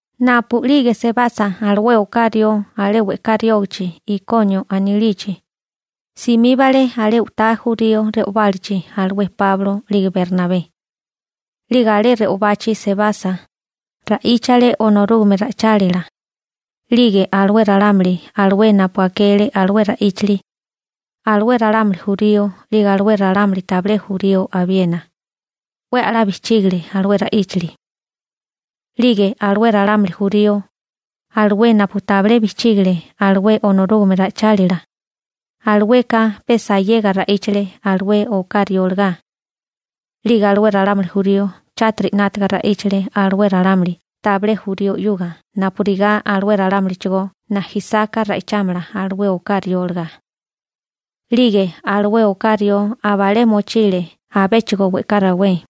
Napu'lige sebasa alué oká rió alé we'ká riógichi Ikonio anilichi, simíbale alé u'tá jurío re'obálachi alué Páulo 'lige Bernabé. 'Lige alé re'obachi sebasa, ra'íchale Onorúgame ra'ichálila. 'Lige alué ralámuli alué napu akele alué ra'íchili, alué ralámuli jurío 'lige alué ralámuli tabilé jurío abiena, 'we 'la bijchígale alué ra'íchali. 'Lige alué ralámuli jurío, alué napu tabilé bijchígile alué Onorúgame ra'ichálila, alueka pe sayega ra'íchale alué oká rió olagá. 'Lige alué ralámuli jurío chátiri 'nátaga ra'íchale alué ralámuli tabilé jurío 'yuga napurigá alué ralámulichigó najisáká ra'ichámala alué oká rió olagá. 'Lige alué oká rió abalé mochile abéchigo we'ká rawé.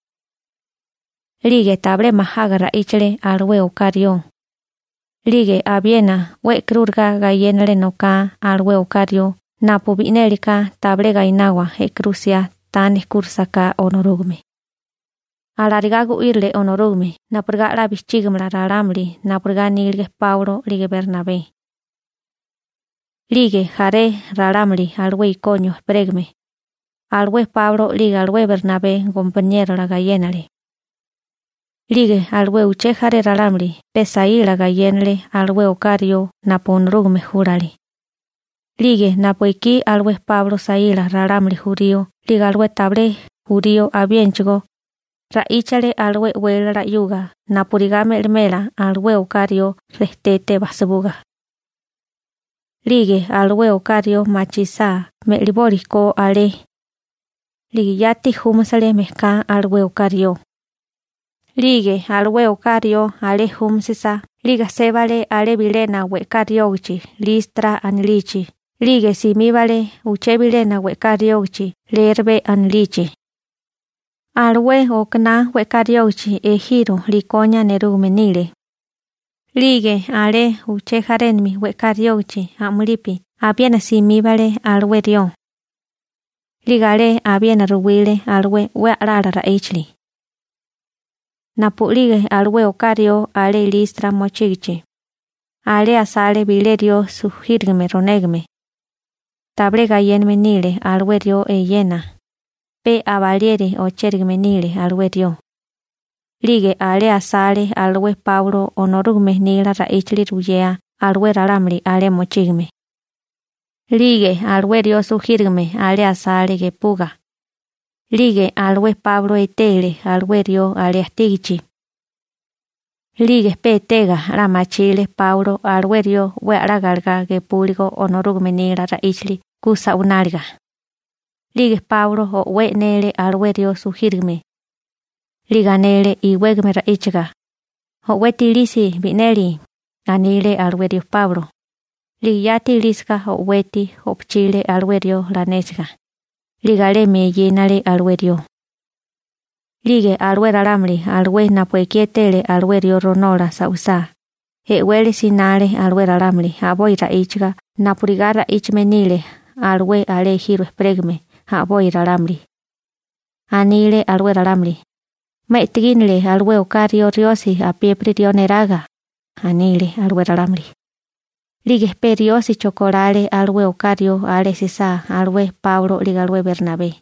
'Lige tabilé majaga ra'íchale alué oká rió. 'Lige abiena 'we e'karúriga gayénale noká alué oká rió napu bi'nélika tabilé gainawa e'karú 'siá ta nejkúrisaká Onorúgame. Alarigá gu'írile Onorúgame napurigá 'la bijchígimala ralámuli napurigá anílige Páulo 'lige Bernabé. 'Lige jaré ralámuli alué Ikonio ejperégame, alué Páulo 'lige alué Bernabé gompaniérola gayénale, 'lige alué uché jaré ralámuli pe saíla gayénale alué oká rió napu Onorúgame júlale. 'Lige napu ekí alué Páulo saíla ralámuli jurío 'lige alué tabilé jurío abiénachigó ra'íchale alué e'wélala 'yuga napurigá me'limela alué oká rió rejtete basibuga. 'Lige alué oká rió machisá me'liboli ko alé, 'lige yati júmasele mejká alué oká rió. 'Lige alué oká rió alé júmisisa 'lige sébale alé bilena we'ká riógichi Listra anilichi 'lige simíbale uché bilena we'ká riógichi Lerbe anilichi. Alué okaná we'ká riógichi ejiro Likonia nerúgame nile. 'Lige alé uché jarénami we'ká riógichi a'mulipi abiena simíbale alué rió. 'Lige alé abiena ruwile alué 'we a'lala ra'íchali. Napu'lige alué oká rió alé Listra mochígichi, alé asale bilé rió sujírigame ronégame. Tabilé gayéname nile alué rió eyena, pe abalieri ochérigame nile alué rió. 'Lige alé asale alué Páulo Onorúgame nila ra'íchali ruyea alué ralámuli alé mochígame, 'lige alué rió sujírigame alé asale gepuga. 'Lige alué Páulo etele alué rió alé ajtígichi. 'Lige pe etega 'la machile Páulo alué rió 'we a'lá galegá gepúligo Onorúgame nila ra'íchali ku sa'wináliga. 'Lige Páulo o'wé e'nele alué rió sujírigame. 'Lige anele iwégame ra'íchaga: ―O'weti ilisi bi'neli ―anile alué rió Páulo. 'Lige yati ilísiga o'weti o'pochile alué rió lanésiga, 'lige alemi eyénale alué rió. 'Lige alué ralámuli alué napu ekí etele alué rió ronola sa'wisá, e'wele sinale alué ralámuli a'boi ra'íchaga napurigá ra'íchame nílige alué alé ejiro ejperégame a'boi ralámuli. Anile alué ralámuli: ―¡'Ma e'tegínele alué oká riosi napuyeri ralámuli neraga! ―anile alué ralámuli. 'Lige pe riósicho kolale alué oká rió alué Páulo 'lige alué Bernabé.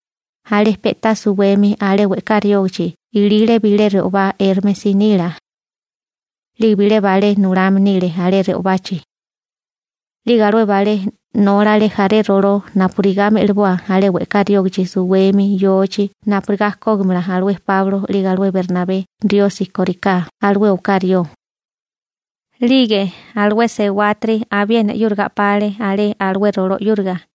Alé pe'tá suwemi alé we'ká riógichi ilile bilé re'obá Érmesi nila. 'Lige bilé balé nulame nile alé re'obachi. 'Lige alué balé nólale jaré roló napurigá me'liboa alé we'ká riógichi suwemi yochi napurigá kógimala alué Páulo 'lige alué Bernabé riosi kóriká alué oká rió. 'Lige alué sewátiri abiena 'yúriga a'pale alé alué roló 'yúriga.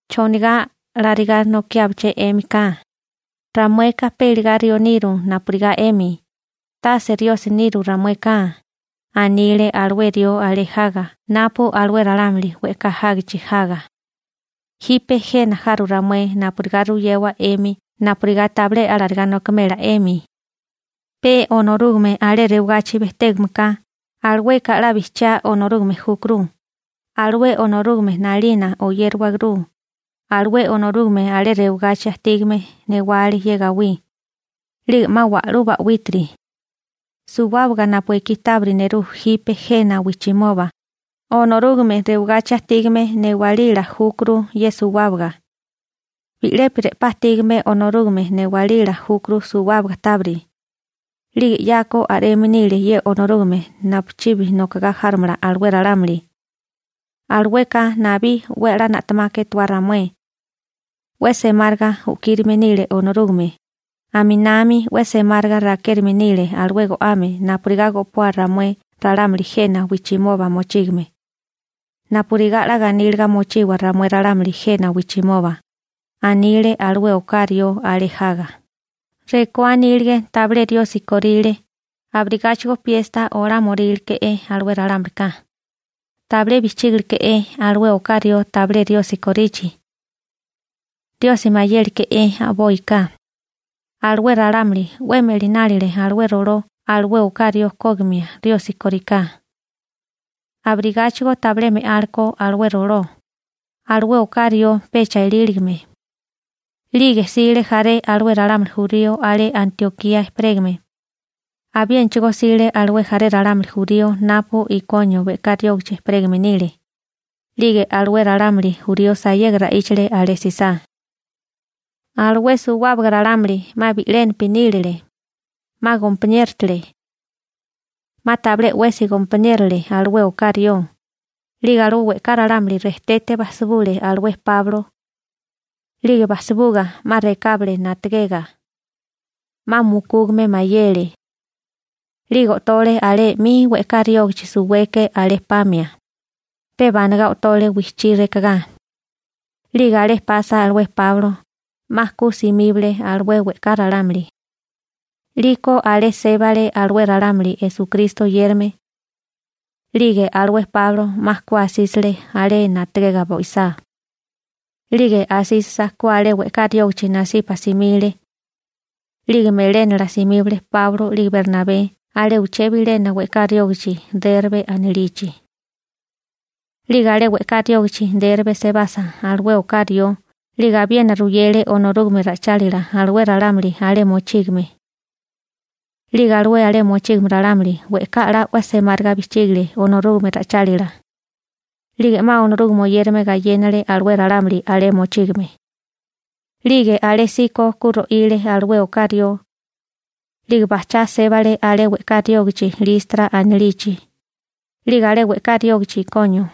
―¿Chonigá alarigá nokiábaché 'émika? Ramueka pe iligá rió niru napurigá 'emi, tase riosi niru ramueka ―anile alué rió alé jaga napu alué ralámuli we'ká jágichi jaga―. Jipe jena jaru ramué napurigá ruyewa 'emi napurigá tabilé alarigá nokimela 'emi. Pe Onorúgame alé rewagachi bejtégame ka, alueka 'la bijchiá Onorúgame júkuru. Alué Onorúgame 'nalina oyérawaguru. Alué Onorúgame alé rewagachi ajtígame newale ye gawí, 'lige 'ma wa'lú ba'wítiri. Suwábaga napu ekí tábiri nerú jipe jena wijchimoba Onorúgame rewagachi ajtígame newalila júkuru ye suwábaga. Bi'lepi re'pá ajtígame Onorúgame newalila júkuru suwábaga tábiri. 'Lige 'yako a'reme nile ye Onorúgame napuchibi nokagá járomala alué ralámuli. Alueka nabí 'we a'lá na'temaka etuá ramué. 'We semáriga u'kírime nile Onorúgame, aminami 'we semáriga rakérime nile alué go'ame napurigá go'poa ramué ralámuli jena wijchimoba mochígame, napurigá 'la ganíliga mochiwa ramué ralámuli jena wijchimoba ―anile alué oká rió alé jaga. Rekó anílige tabilé riosi ko, abirigáchigo piesta olámoríle ko alué ralámulika. Tabilé bijchígileke'é alué oká rió tabilé riosi korichi. Riosi mayéleké'é a'boika. Alué ralámuli 'we me'linálele alué roló alué oká rió kógimia riosi kóriká. Abirigáchigo tabilé me'áleko alué roló, alué oká rió pecha eláligime. 'Lige jsile jaré alué ralámuli jurío alé Antiokía ejperégame. Abiénachigo jsile alé jaré ralámuli jurío napu Ikonio we'ká riógichi ejperégame nile. 'Lige alué ralámuli jurío sayega ra'íchale alé jsisá. Alué suwábaga ralámuli 'ma bi'lénapi nílele, 'ma gompaniérotele. 'Ma tabilé 'wesi gompaniérole alué oká rió. 'Lige alué we'ká ralámuli rejtete basibule alué Páulo. 'Lige basibuga 'ma rekábale na'tagega. 'Ma mukúgame mayele. 'Lige o'tole alé 'mi we'ká riógichi suweke alé pamia, pe banagá o'tole wijchí rekagá. 'Lige alé pasa alué Páulo, 'ma ku simíbale alué we'ká ralámuli. 'Liko alé sébale alué ralámuli Esukristo oyérame. 'Lige alué Páulo 'ma ku asísile alé na'tagega bo'isá. 'Lige asísisa ku alé we'ká riógichi nasipa simile. 'Lige melénala simíbale Páulo 'lige Bernabé alé uché bilena we'ká riógichi Berbe anilichi. 'Lige alé we'ká riógichi Berbe sebasa alué oká rió 'lige abiena ruyele Onorúgame ra'ichálila alué ralámuli alé mochígame. 'Lige alué alé mochígame ralámuli we'ká 'la 'we semáriga bijchígale Onorúgame ra'ichálila. 'Lige 'ma Onorúgame oyérame gayénale alué ralámuli alé mochígame. 'Lige alésíko ku ro'ile alué oká rió. 'Lige bajchá sébale alé we'ká riógichi Listra anilichi, 'lige alé we'ká riógichi Ikonio,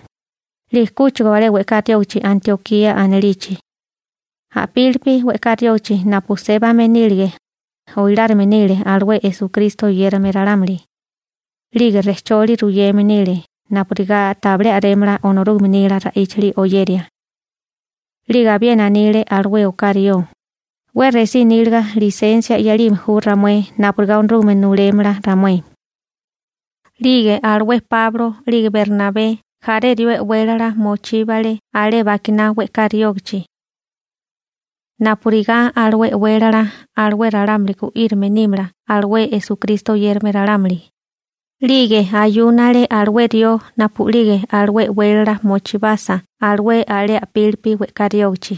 'lige kúchigo alé we'ká riógichi Antiokía anilichi. A'pílipi we'ká riógichi napu sébame nílige, oilárime nile alué Esukristo oyérame ralámuli, 'lige rejcholi ruyeme nile napurigá tabilé a'rémala Onorúgame nila ra'íchali oyeria. 'Lige abiena anile alué oká rió: ―'We resí níliga lisensia 'yalime ju ramué napurigá Onorúgamete nulémala ramué. 'Lige alué Páulo 'lige Bernabé e'wélala mochíile pe u'kabi rió alé bakiná we'ká riógichi napurigá alué e'wélala ralámuli gu'írime nímala Esukristo oyérame ralámuli. 'Lige ayúnale alué rió napu'lige alué e'wélala mochíbasa alué alé a'pili we'ká riógichi.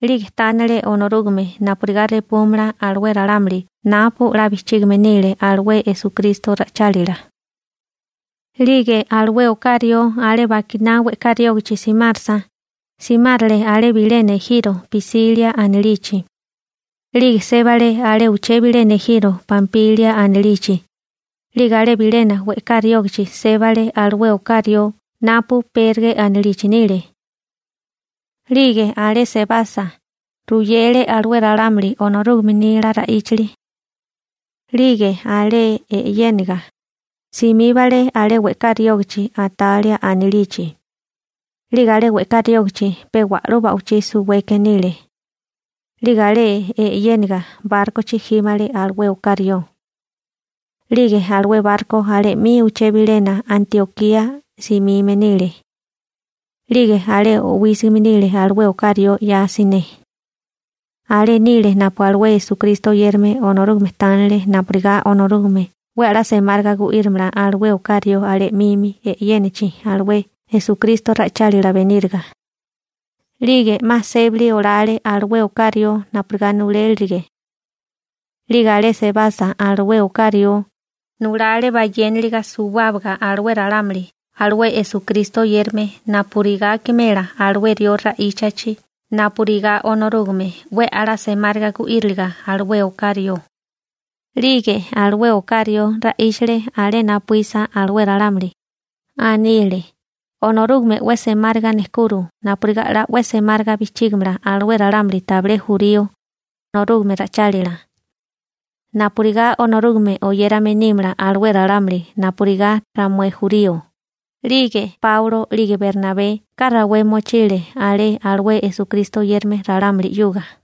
'Lige tánale Onorúgame napurigá repúmala alué ralámuli napu 'la bijchígime nile alué Esukristo ra'ichálila. 'Lige alué oká rió alé bakiná we'ká riógichi simárasa, simárele alé bilena ejiro Pisilia anilichi. 'Lige sébale alé uché bilena ejiro Pampilia anilichi. 'Lige alé bilena we'ká riógichi sébale alué oká rió napu Perge anilichi nile. 'Lige alé sebasa, ruyele alué ralámuli Onorúgame nila ra'íchali. 'Lige alé e'yéniga, simíbale alé alué we'ká riógichi Atalia anilichi. 'Lige alé we'ká riógichi pe wa'lú ba'wichí suweke nile. 'Lige alé e'yéniga bárkochi jímale alué oká rió, 'lige alué barko alé 'mi uché bilena Antiokía simime nile. 'Lige alé o'wísigime nile alué oká rió 'ya siné. Alé nile napu alué Esukristo oyérame Onorúgame tánele napurigá Onorúgame 'we a'lá semáriga gu'írimala alué oká rió alé 'mimi e'yénachi alué Esukristo ra'ichálila beníriga. 'Lige 'ma sébali olale alué oká rió napurigá nulélirige. 'Lige alé sebasa alué oká rió, nulale bayéniliga suwábaga alué ralámuli alué Esukristo oyérame napurigá akimela alué rió ra'íchachi napurigá Onorúgame 'we a'lá semáriga gu'íriliga alué oká rió. 'Lige alué oká rió ra'íchale alé napuísa alué ralámuli. Anile: ―Onorúgame 'we semáriga nejkuro napurigá 'la 'we semáriga bijchígimala alué ralámuli tabilé jurío Onorúgame ra'ichálila, napurigá Onorúgame oyérame nímala alué ralámuli napurigá ramué jurío. 'Lige Páulo 'lige Bernabé we'ká rawé mochile alé alué Esukristo oyérame ralámuli 'yuga.